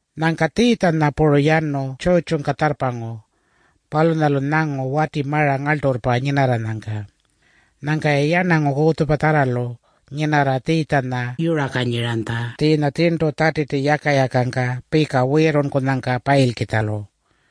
Nyangka Tjiitjanya puru yanu tjurrtjungka tjarrpangu. Palunyalu nyangu wati mara ngarlturrpa nyinarranyangka. Nyangka-ya yarnangu kutjupatjarralu nyinarra Tjiitjanya yurakanyiranytja tjiinya tjirntu Tjatiti yaka-yakangka pika wiirrunnyangka payilkitjalu.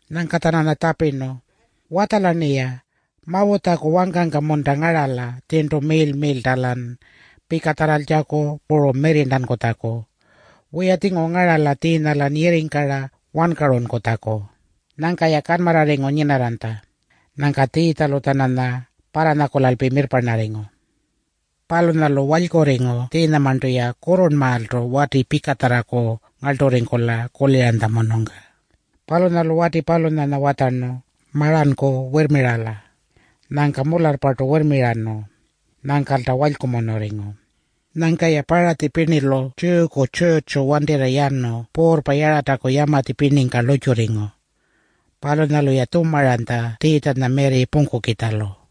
Nyangka-tjananya tjapirnu, “Watjala-rni. Mawutjaku wangka-munta ngarala tjirntu miirl-miirlta-lan pikatjarraltjaku puru mirrirntankutjaku? Wiya-tjinguru ngarala tjiinya-lan yirringkara wankarunkutjaku.” Nyangka-ya kanmarrarringu nyinarranytja. Nyangka Tjiitjalu-tjananya parranyakulalpi mirrparnarringu. Palunyalu walykurringu tjiinyamarntu-ya kurrurnmaaltu wati pikatjarraku ngarlturringkula kuliranytjamunungka. Palunyalu wati palunyanya watjarnu, “Maranku wirrmirala.” Nyangka mularrpartu wirrmirarnu. Nyangkalta walykumunurringu. Nyangka-ya Paratji pirnilu Tjiyuku tjurrtju wantirra yanu puurrpa Yarataku yamatji pirningka lurrtjurringu. Palunyalu-ya tjumaranytja Tjiitjanya mirri pungkukitjalu.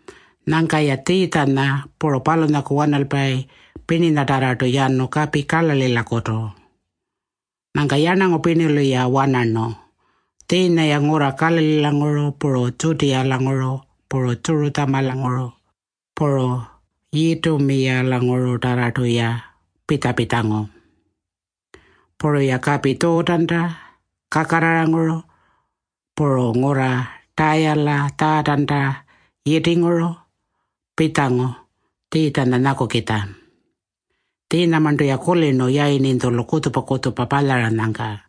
Nyangka-ya Tjiitjanya puru palunyaku wanalpayi pirninyatarrartu yanu kapi Kalalilakutu. Nyangka yarnangu pirnilu-ya wanarnu. Tjiinya-ya ngurra Kalalilanguru puru Tjutiyalanguru, puru Tjurutjamalanguru, puru Yitumiyalangurutarrartu-ya pitja-pitjangu. Puru-ya kapi Tjuutanta kakarraranguru puru ngurra Tayala Tjaatanta yitinguru pitjangu Tjiitjanya nyakukitja. Tjiinyamarntu-ya kulirnu yayirninytjulu kutjupa-kutjupa palyaranyangka.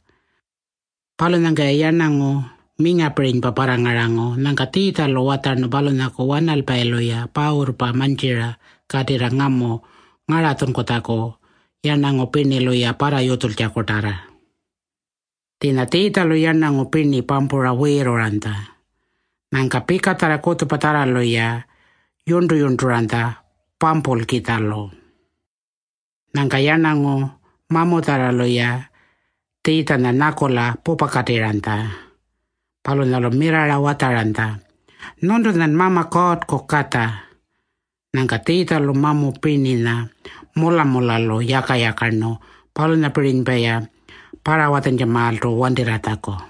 Palunyangka-ya yarnangu mingapirinypa parrangarangu. Nyangka Tjiitjalu watjarnu palunyaku wanalpayilu-ya pawurrpa mantjira katirra ngamu ngaratjunkutjaku, yarnangu pirnilu-ya parrayutjultjakutarra. Tjiinya Tjiitjalu yarnangu pirni pampura wiirruranytja. Nyangka pikatjarra kutjupatjarralu-ya yurntu-yurnturanytja pampulkitjalu. Nyangka yarnangu mamutjarralu-ya Tjiitjanya nyakula pupakatirranytja. Palunyalu mirrarra watjaranytja, “Nyuntunyan Mama Kuurrku Katja.” Nyangka Tjiitjalu mamu pirninya mula-mulalu yaka-yakarnu palunyapirinypa-ya parrawatjantjamaaltu wantirratjaku.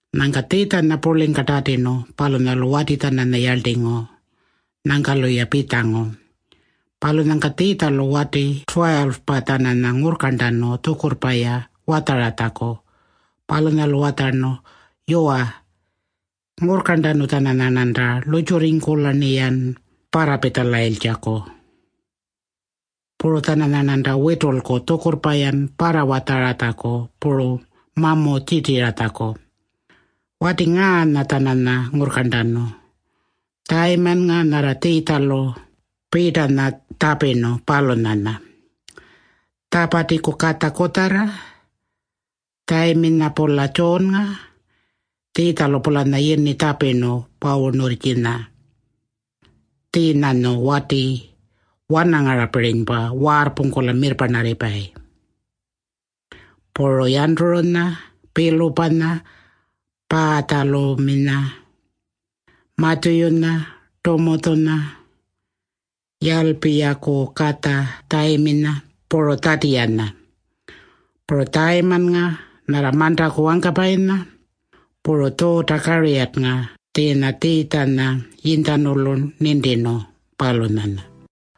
Nyangka Tjiitjanya purlingka tatirnu. Palunyalu wati-tjananya yarltingu. Nyangka-luya pitjangu. Palunyangka Tjiitjalu wati 12-pa-tjananya ngurrkarntanu tjukurrpa-ya watjaratjaku. Palunyalu watjarnu, “Yuwa, ngurrkarntanu-tjananyarnanta lurrtjurringkula-rniyan parrapitjalayinkutjaku. Puru-tjananyarnanta witulku tjukurrpa-yan parrawatjaratjaku puru mamu tjirtiratjaku.” Wati ngaanya-tjananya ngurrkarntanu: Tjayimannga nyarra Tjiitjalu Piitanya tjapirnu, palunyanya. Tjapatiku katja kutjarra Tjayiminya-pula Tjuunnga. Tjiinya Tjiitjalu-pulanya yini tjapirnu Pawunurrtjinya. Tjiinyanyu wati wanangarapirinypa — waarrpungkula mirrparnarripayi. Puru Yanturunya, Pilupanya, Paatjaluminya, Matjuyunya, Tumutjunya, Yalpiyaku katja Tjayiminya, puru Tjatiyanya. Puru Tjayimannga nyarra mantaku wangkapayinya. Puru Tjuuta-Kariyarrnga tjiinya Tjiitjanya yinytjanulu nintirnu, palunyanya.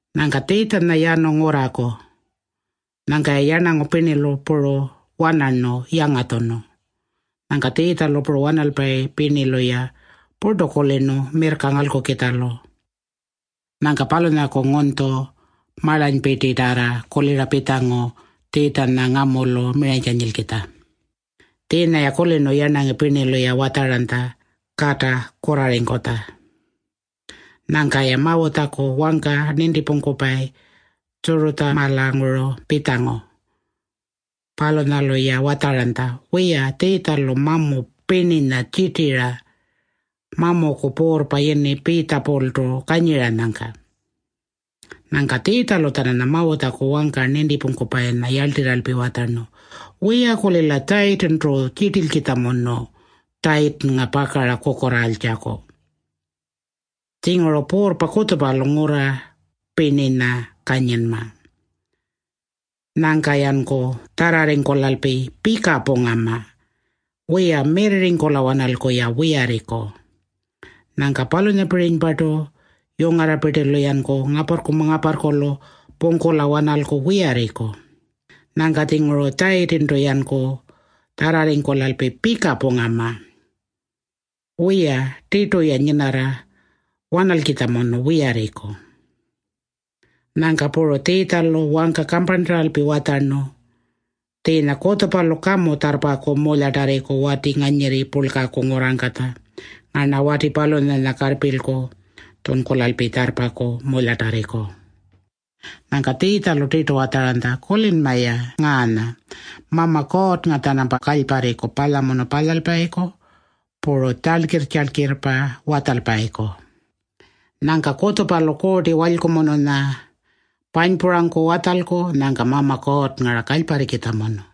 Nyangka Tjiitjanya yanu ngurraku. Nyangka-ya yarnangu pirnilu puru wanarnu yangatjunu. Nyangka Tjiitjalu puru wanalpayi pirnilu-ya purtu kulirnu mirrka ngalkukitjalu. Nyangka palunyaku ngunytju marlanypirtitarra kulira pitjangu Tjiitjanya ngamulu miranykanyilkitja. Tjiinya-ya kulirnu yarnangu pirnilu-ya watjaranytja kata kurrarringkutja. Nyangka-ya Mawutjaku wangka nintipungkupayi Tjurutjamalanguru pitjangu. Palunyalu-ya watjaranytja, “Wiya, Tjiitjalu mamu pirninya tjirtira mamuku puurrpa yini Piitjapultu kanyiranyangka.” Nyangka Tjiitjalu-tjananya Mawutjaku wangka nintipungkupayinya yarltirralpi watjarnu, “Wiya-kulila Tjayitintu tjirtilkitjamunu Tjayitinnga pakara kukurraaltjaku. Tjinguru puurrpa kutjupalu ngurra pirninya kanyinma. Nyangka-yanku tjarrarringkulalpi pika pungama. Wiya, mirrirringkula-wanalku-ya wiyarriku. Nyangka palunyapirinypartu yungarrapirtilu-yanku ngaparrku-ngaparrkulu pungkula-wanalku wiyarriku. Nyangka-tjinguru Tjayitintu-yanku tjarrarringkulalpi pika pungama. Wiya, tirtu-ya nyinarra-wanalkitjamunu wiyarriku.” Nyangka puru Tjiitjalu wangka kamparntaralpi watjarnu, “Tjiinya kutjupalu kamu tjarrpaku mulyatarriku wati nganyirri purlkaku ngurrangkatja. Ngarna wati palunyanya karrpilku tjunkulalpi tjarrpaku mulyatarriku.” Nyangka Tjiitjalu tirtu watjaranytja, “Kulinma-ya ngaanya. Mama Kuurrnga-tjanampa kalyparriku palyamunu palyalpayiku puru tjalkirr-tjalkirrpa watjalpayiku. Nyangka kutjupalu Kuurti Walykumununya panypurangku watjalku. Nyangka Mama Kuurrnga-ra kalyparrikitjamunu.”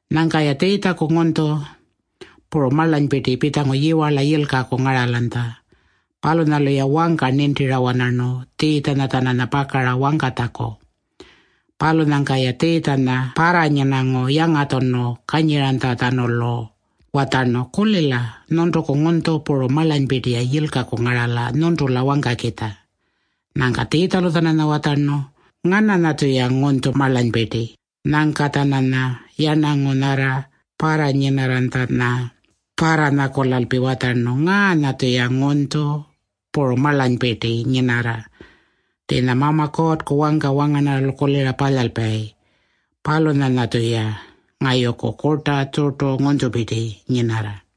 Nyangka-ya Tjiitjaku ngunytju puru marlanypirti pitjangu yiwarla yilkaku ngaralanytja. Palunyalu-ya wangka nintira-wanarnu Tjiitjanya-tjananya pakara wangkatjaku. Palunyangka-ya Tjiitjanya parranyinangu yangatjunu kanyiranytjatjanulu watjarnu, “Kulila. Nyuntuku ngunytju puru marlanypirti-ya yilkaku ngarala nyuntula wangkakitja.” Nyangka Tjiitjalu-tjananya watjarnu, “Ngananya-tjuya ngunytju marlanypirti?” Nyangka-tjananya yarnangu nyarra parranyinarranytjanya parranyakulalpi watjarnu, “Ngaanya-tjuya ngunytju puru marlanypirti nyinarra. Tjiinya Mama Kuurrku wangka wangarnarralu kulira palyalpayi, palunyanya-tjuya ngayuku kurta, tjurtu ngunytjupirti nyinarra.”